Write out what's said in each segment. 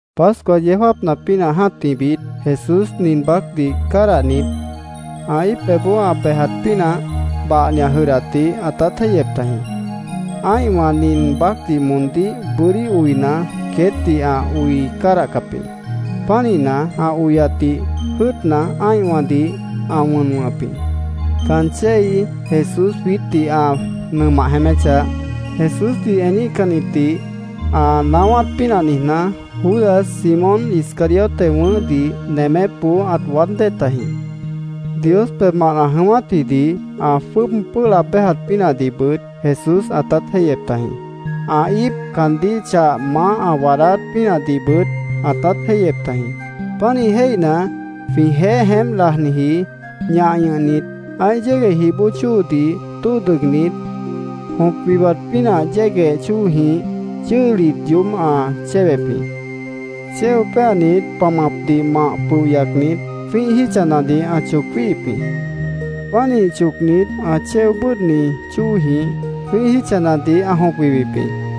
Pascua yeó jáapna pínah jã́tihbit, Jesús nin baácdih cádahnit, ã íip pebhboó ã bejat pínah bahni ã jʉdhdatdih ãtát jéihyep tajĩ. Ã́ihwã nin baácdih moondíh bʉ́dí oina, queétdih ã oi cádahcap jĩ. Pánihna, ã oyatdih jʉ́ʉtna, ã́ihwãdih ã wʉn wʉ̃hʉp jĩ. Caan chéi Jesús jwiítdih ã nʉmah jeéméchah, Jesúsdih eníhcannitdih ã naáwát pínah niijná, Judas, Simón Iscariote wʉ̃ʉ́hdih nemépboó ãt waád dée tajĩ. Dios pebhmant ã jʉ̃ʉ́wátjidih, ã jwʉ́ʉb pʉ́ʉh laab béjat pínahdihbʉt Jesús ãtát jéihyep tajĩ. Ã íip caandíh chah maáh ã waadáát pínahdihbʉt ãtát jéihyep tajĩ. Pánih jéihna, jwĩjeéh jeémp lajniji ñah ñʉhnit, ã́ih yégueh jih bóo chóodih tóo dʉgnit, jõp wiwat pínah yégueh chóojĩh chʉ́hlit yoób ã chéwep jĩ. Chéo péanit, pamapdih mah pʉoh yacnit, jwĩ́ih jítchanadih ã choc jwíihip jĩ. Pánih chocnit, ã chéo bʉ́ʉdhni chóojĩh jwĩ́ih jítchanadih ã jõp wiwip jĩ.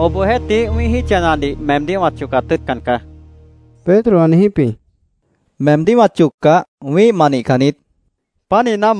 —Obohjeéhtih, wĩ́ih jítchanadih meemdíh wã chocat tʉ́ʉtcan caá, Pedro ã niijíp jĩ. —Meemdíh wã choccah, wĩ́ih ma nihcan niít, Jesús caandíh ã niijíp jĩ.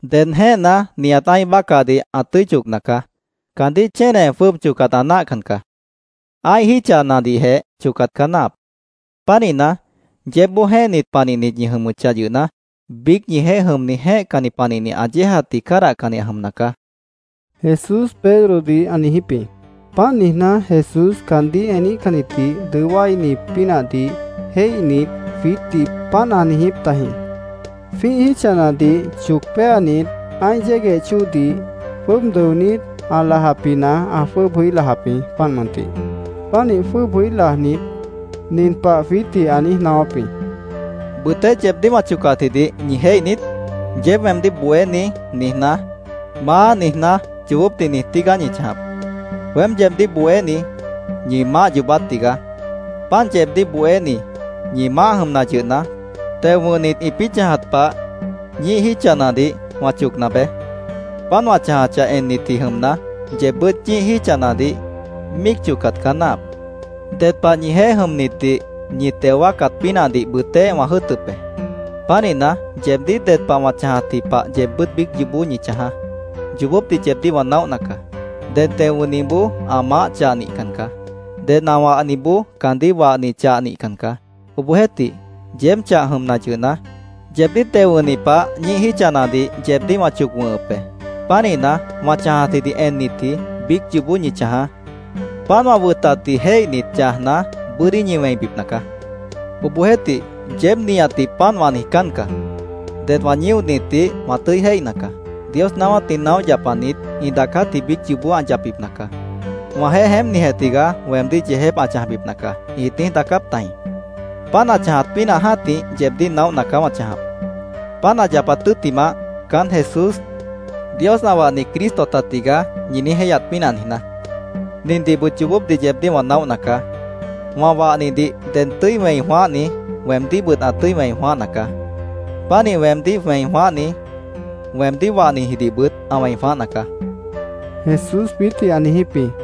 —Ded jẽ́ehna, nihat ã́ih bácahdih ã tʉ́i chocna caá. Caandíh chéne jwʉ́ʉb chocat ã náahcan caá. Ã́ih jítchanadihjeh chocat caá náahap. Pánihna, yeébboó jẽ́ehnit panihnit ñi jʉmʉchah yʉhna, biíc ñijeéh jʉmni jẽ́ehcanni panihni ã yéejatdih cádahcanni ã jʉmna caá, Jesús Pedrodih ã niijíp jĩ. Páant niijná, Jesús caandíh eníhcannitdih dʉó wáini pínahdih jéihnit, jwiítdih páant ãt niijíp tajĩ. Jwĩ́ih jítchanadih choc péanit, ã́ih yégueh chóodih jwʉ́ʉb dʉonít, ã lajapjina ã jwʉ́ʉb jʉí lajap jĩ, páant mʉntih. Pánih jwʉ́ʉb jʉí lajnit, nin pah jwiítdih ã niíj naáwáp jĩ: —¿Bʉtéh yeebdíh wã chocatjidih ñi jéih niít? Yeéb weemdíh ‘Bohéní’, niijná, ‘Maá’, niijná, yoobópdih niij tígaá ñi chãjap. Weém yeebdíh bohéni, ñi Maáh yoobát tigaá. Páant yeebdíh bohéni, ñi Maáh jʉmna yʉhna, teo wʉ̃hnit ĩpĩ́ chãjat pah ñíih jítchanadih wã chocna beé. Páant wã chãjachah ennitji jʉmna, yeebbʉ́t ñíih jítchanadih míic chocat caá náahap. Ded pah ñijeéh jʉmnitdih ñi teo wáacat pínahdih bʉtéh wã jʉ́ʉtʉp be. Pánihna, yeebdíh ded pah wã chãjatji pah yeebbʉ́t biíc yoobó ñi chãjaá. Yoobópdih yeebdíh wã naóhna caá. Ded teo wʉ̃hniboó ã maáh chah nihcan caá. Ded ã wahniboó caandíh wahni chah nihcan caá.Obohjeéhtih, yeéb chah jʉmna yʉhna, yeebdíh teo wʉ̃hni pah ñíih jítchanadih yeebdíh wã choc wʉ̃hʉp be. Pánihna, wã chãjatjidih ennitji biíc yoobó ñi chãjaá. Páant wã wʉtatdih jéihnit, chãjna, bʉ́dí ñi wẽibipna caá. “Obohjeéhtih, yeéb nihatdih páant wã niijcán caá. Det wã ñíonitdih wã tʉ́i jéihna caá. Dios naáwátdih naóh yapanit ĩ daacátji biíc yoobó ã yapbipna caá. ‘Wãjeéh jeémpnijeh tigaá weemdíh yeejép ã chãjbipna caá’, ĩt niíj daacáp tajĩ. Páant ã chãjat pínah jã́tih yeebdíh naóhna caá wã chãjap, páant ã yapat tʉ́ttimah, ‘Caán Jesús, Dios ã wahni Cristo ta tigaá’, ñi niíj jéihyat pínah niijná. Nindihbʉt yoobópdih yeebdíh wã naóhna caá. Wã wahnidih ded tʉ́i wẽi jwãáhni, weemdíhbʉt ã tʉ́i wẽi jwãáhna caá. Pánih weemdíh wẽi jwãáhni, weemdíh wahnijidihbʉt ã wẽi jwãáhna caá”, Jesús jwiítdih ã niijíp jĩ.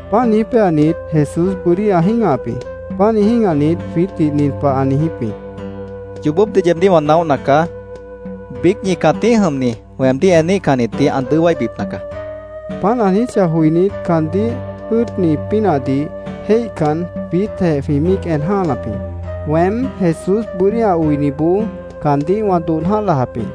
Páant niíj péanit, Jesús bʉ́dí ã jĩ́gahap jĩ. Pánih jĩ́gahnit, jwiítdih nin pah ã niijíp jĩ: —Yoobópdih yeebdíh wã naóhna caá. Biíc ñi cãtíh jʉmni weemdíh eníhcannitdih ã dʉó wáibipna caá, ã niijíp jĩ. Páant ã niijíchah joinít, caandíh jʉ́ʉtni pínahdih jéihcan, jwiítjeh jwĩ míic en jã́hanap jĩ. Weém, Jesús bʉ́dí ã oiniboó caandíh wã dodh jã́ah lajap jĩ.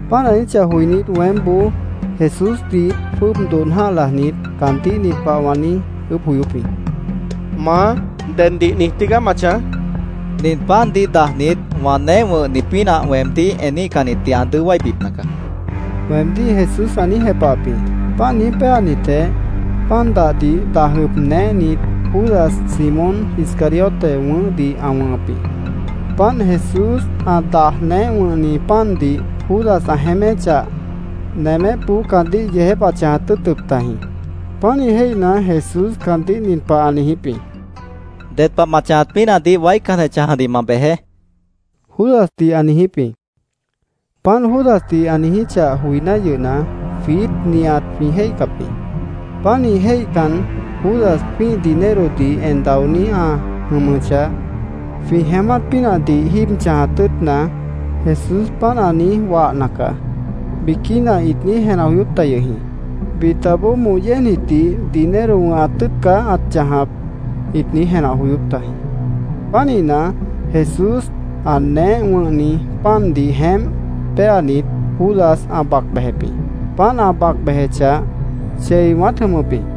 Páant ã niijíchah joinít, weémboó Jesúsdih jwʉ́ʉb dodh jã́ah lajnit, caandíh nin pah wã niíj ʉʉ́bh joyóp jĩ: —¿Maá, deddih niij tígaá ma chãj? wã niijíp jĩ. —Nin pandih dajnit wã neéh wʉ̃hni pínah weemdíh eníhcannitdih ã dʉó wáibipna caá, weemdíh Jesús ã niíj jepahap jĩ. Páant niíj péanitjeh, pan dahdih daj ʉb neéhnit, Judas, Simón Iscariote wʉ̃ʉ́hdih ã wʉ̃hʉp jĩ. Páant Jesús ã daj neéh wʉ̃hni pandih Judas ã jeéméchah, nemépboó caandíh yeejép ãt chãjat tʉ́ʉtʉp tajĩ. Pánih jéihna, Jesús caandíh nin pah ã niijíp jĩ: —Ded pah ma chãjat pínahdih waícanjeh chãjadih ma bejeé, Judasdih ã niijíp jĩ. Páant Judasdih ã niijíchah joiná yʉhna, jwiít nihat jwĩ jéihcap jĩ. Pánih jéihcan, “Judas jwĩ́ih dinerodih en daoní ã jʉmʉchah, jwĩ jeémát pínahdih jíib chãjat tʉ́ʉtna, Jesús páant ã niíj wahna caá”, biquína ĩt niíj jenah joyóp ta yʉh jĩ. Bitaboó “Moh yéejnitdih dinero wʉ̃hat tʉ́ʉtna caá ãt chãjap”, ĩt niíj jenah joyóp tajĩ. Pánihna, Jesús ã neéh wʉ̃hni pandih jeémp péanit, Judas ã bac bejep jĩ. Páant ã bac bejechah, chei wãát jʉmʉp jĩ.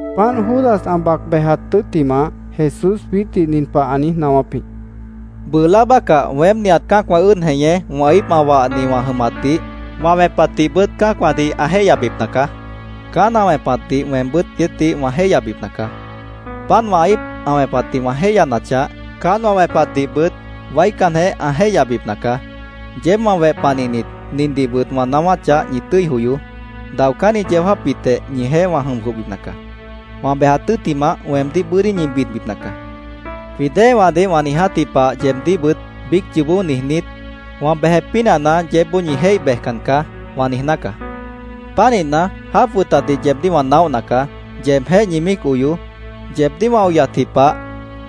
Páant Judas ã bac bejat tʉ́ttimah, Jesús jwiítdih nin pah ã niíj naáwáp jĩ: —Bʉʉ láa bácah weém nihat cã́acwã ʉ́ʉd jeñé wã íip ã wahni wã jʉmatdih, wã wẽpatdihbʉt cã́acwãdih ã jéihyabipna caá. Caán ã wẽpatdih weembʉ́t queétdih wã jéihyabipna caá. Páant wã íip ã wẽpatdih wã jéihyanachah, caán wã wẽpatdihbʉt waícanjeh ã jéihyabipna caá. Yeéb wã weh panihnit, nindihbʉt wã naáwáchah ñi tʉ́i joyoó. Daocánni yeó jáapbitjeh ñijeéh wã jʉm jwʉhbipna caá. Wã bejat tʉ́ttimah, weemdíh bʉ́dí ñi bidbipna caá. Jwĩ déewãdih wã niijátji pah yeebdíhbʉt biíc yoobó niijnít, ‘Wã bejep pínahna yeébboó ñi jéih bejcan caá’, wã niijná caá. Pánihna, jáap wʉtatdih yeebdíh wã naóhna caá. Yeebjéh ñi míic oyoó. Yeebdíh wã oyatji pah,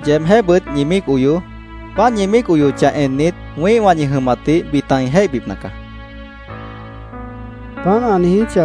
yeebjéhbʉt ñi míic oyoó. Páant ñi míic oyochah ennit, wĩ́ihwã ñi jʉmatdih bita ĩ jéihbipna caá, Jesús jwiítdih ã niijíp jĩ.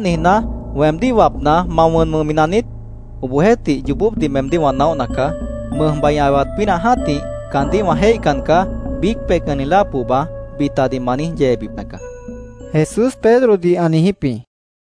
—Páant niijná, ¿weemdíh wapna, ma wʉn wʉ̃hmi naniít? Obohjeéhtih, yoobópdih meemdíh wã naóhna caá. Mʉjbai ã ewat pínah jã́tih, ‘Caandíh wã jéihcan caá’, biíc peihcanni láa pohba bitadih ma niíj yeebipna caá, Jesús Pedrodih ã niijíp jĩ.